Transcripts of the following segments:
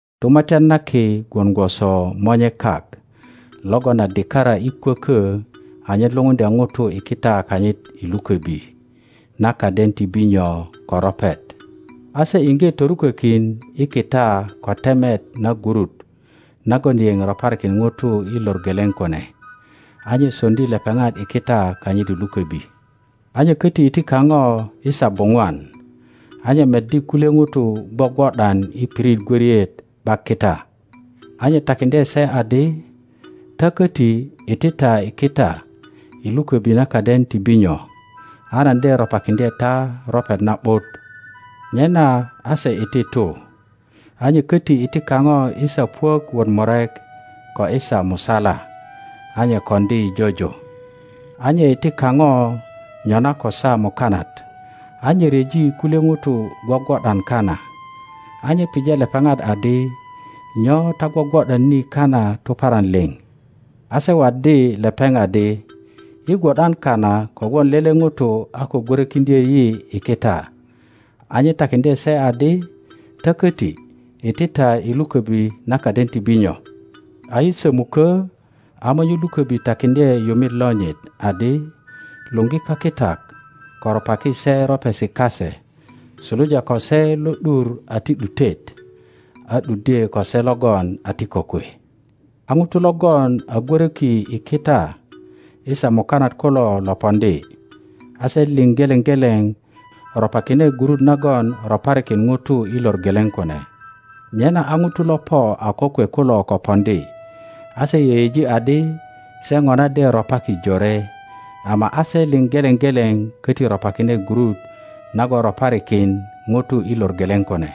Tumatyan na Ki gwon gwoso monye kak logon a dikara i kwökö anyen lupuŋdya ŋutu i kita kanyit i lukobi na kaden ti binyo ko ropet. A se iŋge torukökin i kita ko temet na gurut nagon yeŋ roparikin ŋuto i lor geleŋ kune, a nye soŋdi lepeŋat i kita kanyit i luköbi. A nye köti iti kaŋo i saa buŋwan, a nye meddi kulye ŋutu gwogwo ’dan i pirit gwöriet ’bak kita; a nye takiŋdye se adi, Ta koti, iti ta i kita i luköbi na kaden ti binyo, a nan de ropakiŋdye ta ropet na ’but. Nyena a se iti tu. A nye köti iti kaŋo i saa puök wot murek, ko i saa musala, a nye koŋdi jojo. A nye iti kaŋo nyona ko saa mukanat, a nye ryeji kulye ŋutu gwogwo ’dan kana. A nye pije lepeŋat adi, Nyo ta gwogwo ’dan ni kana tuparan liŋ? A se waddi lepeŋ adi, Yi gwo ’dan kana kogwon lele ŋuto a ko gwörökiŋdyö yi i kita. A nye takiŋdye se adi, Ta koti, iti ta i luköbi na kaden ti binyo. A i sömukö, a monye luköbi takiŋdye yumi lonyit adi, Luŋgi kakitak ko ropaki se ropesi kase, suluja ko se lo ’dur a ti ’dutet a ’duddye ko se logon a ti kokwe. A ŋutu logon a gwöroki i kita i saa mukanat kulo lo poŋdi, a se liŋ geleŋ geleŋ ropakine gurut nagon roparikin ŋuto i lor geleŋ kune. Nyena a ŋutu lo po a kokwe kulo ko poŋdi, a se yeyeji adi se ŋona de ropaki jore, ama a se liŋ geleŋ geleŋ köti ropakine gurut nagon roparikin ŋuto i lor geleŋ kune.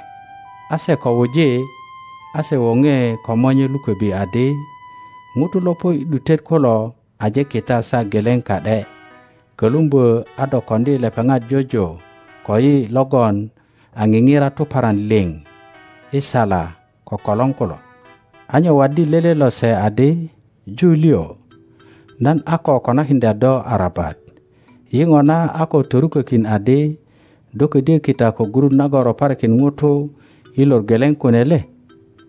A se ko wuji, a se woŋe ko monye luköbi adi. Ŋutu lo po i ’dutet kulo aje kita saa geleŋ ka ’de, kölumbö a do koŋdi lepepat jojo koyi logon a nigira tuparan liŋ i sala ko kolor kulo! a nye waddi lele lose adi, Ju liŋ, nan a ko konakiŋdya do arabat. Yi ŋona a ko torukökin adi do ködyö kita ko gurut nagon roparikin ŋuto i lor geleŋ kune le?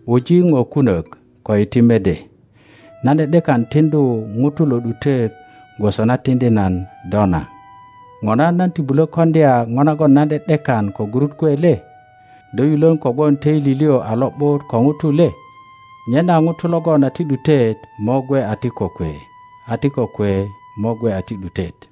Wuji po kunök, ko iti mede. Nan ’de ’dekan tiŋdu ŋuto lo ’dutet gwoso na tiŋdi nan do na. Ŋona nan ti bulö koŋdya po nagon nan ’de ’dekan ko gurut kwe le? Do yulön kogwon töili liŋ a lo ’but ko ŋutu le? Nyena ŋutu logon a ti ’dutet mo gwe a ti kokwe, a ti kokwe mo gwe a ti ’dutet.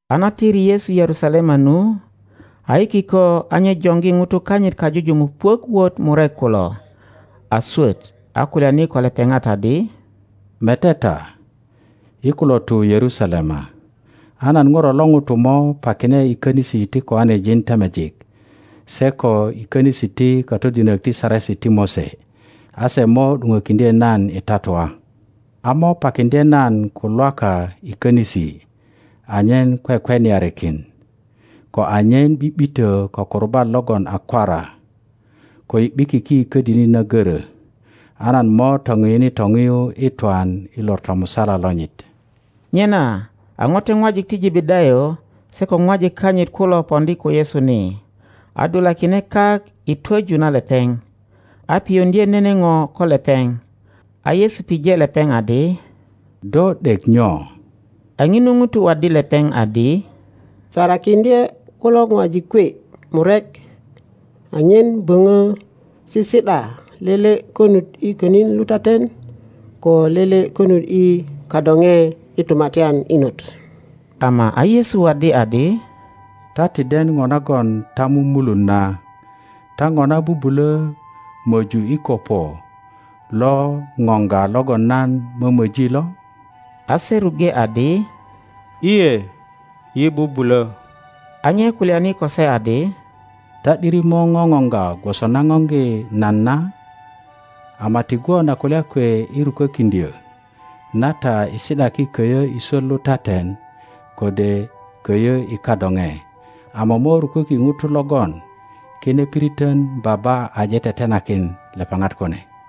A na tiri Yesu Yerusalema nu, a i kiko a nye joŋgi ŋutu kanyit kajujumuk puök wot murek kulo a swöt, a kulyani ko lepeŋat adi, Mete ta, yi kulo tu Yerusalema, a nan Ŋuro lo ŋuto mo pakine i konisi ti koanejin temejik se ko i könisi ti katodinok ti Saresi ti Mose. A se mo ’duŋökiŋdye nan i tatua, a mo pakiŋdye nan ko Lwaka i könisi anyen kwekweniarikin, ko anyen ’bi ’bitö ko kurubat logon a kwara, ko i ’bikiki i ködini na göro, a nan mo topiyuni topiyu i twan i lor tomusala lonyit. Nyena a ŋote ŋwajik ti Jebedayo se ko ŋwajik kanyit kulo poŋdi ko Yesu ni, a dulakine kak i twoju na lepeŋ, a piyuŋdye nene po ko lepeŋ. A Yesu pije lepeŋ. adi, Do ’dek nyo? A ŋinu ŋuto waddi lepeŋ. adi, Sarakiŋdye kulo ŋwajik kwe murek anyen böpö sisi ’da lele konut i könin lutaten ko lele konut i kadoŋe i tumatyan inot. Ama a Yesu waddi adi, Ta ti den po nagon ta mumulun na. Ta ŋona bubulö möju i kopo lo ŋoŋga logon nan mömöji lo? A se ruŋge adi, lye, yi bubulö. a nye kulyani ko se adi, Ta ’diri mo ŋoŋoŋga gwoso na ŋoŋgi nan na, ama ti gwon a kulya kwe i rukökiŋdyö na ta i si ’daki köyö i swöt lutaten kode köyö i kadoŋe, ama mo ruköki ŋutu logon kine piritön Baba aje tetenakin lepeŋat kune.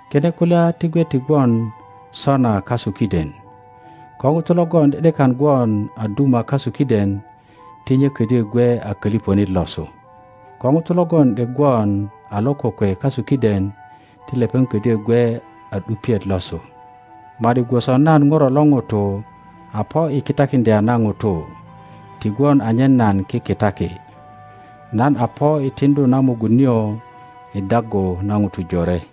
Kine kulya ti gwe ti gwon sona kasu kiden; ko ŋuto logon ’de ’dekan gwon a duma kasu kiden ti nye ködyö gwe a kölipönit losu. Ko ŋuto logon ’dek gwon a lo kokwe kasu kiden, ti lepeŋ. ködyö gwe a ’dupiet losu; ma ’di gwoso nan Ŋuro lo ŋuto a po i kitakiŋdya na ŋutu, ti gwon anyen nan kikitaki; nan a po i tiŋdu na mugun nio i daggu na ŋutu jore.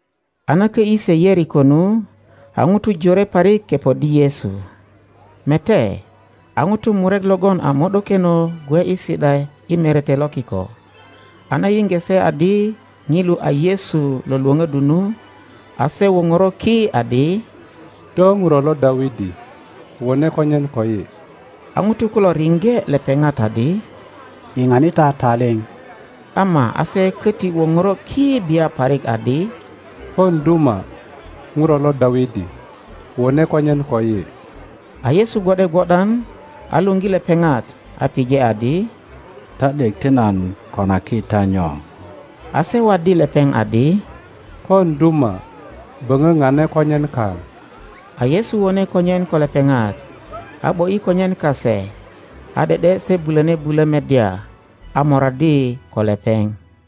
A na kö ’yi se Yeriko nu, a ŋutu jore parik kepoddi Yesu. Mete, a ŋutu murek logon a mo ’dokeno gwe i si ’da i merete lo kiko, a na yiŋge se adi ŋilu a Yesu lo lwöpöddu nu, a se woŋoro ki adi, Do ŋuro lo Dawidi, wone konyen koyi! A ŋutu kulo riŋge lepeŋat adi, Yiŋani ta taliŋ! Ama a se köti woŋoro ki bia parik adi, Pon duma, ŋuro lo Dawidi, wone konyen koyi! A Yesu gwo ’de gwo ’dan a luŋgi lepeŋat, a pije adi, Ta ’dek ti nan konaki ta nyo? a se waddi lepeŋ adi, Pon duma, böŋö pane konyen kaŋ. A Yesu wone konyen ko lepeŋat, a ’bo ’yi konyen kase, a ’de ’de se bulöni bulö meddya, a moraddi ko lepeŋ.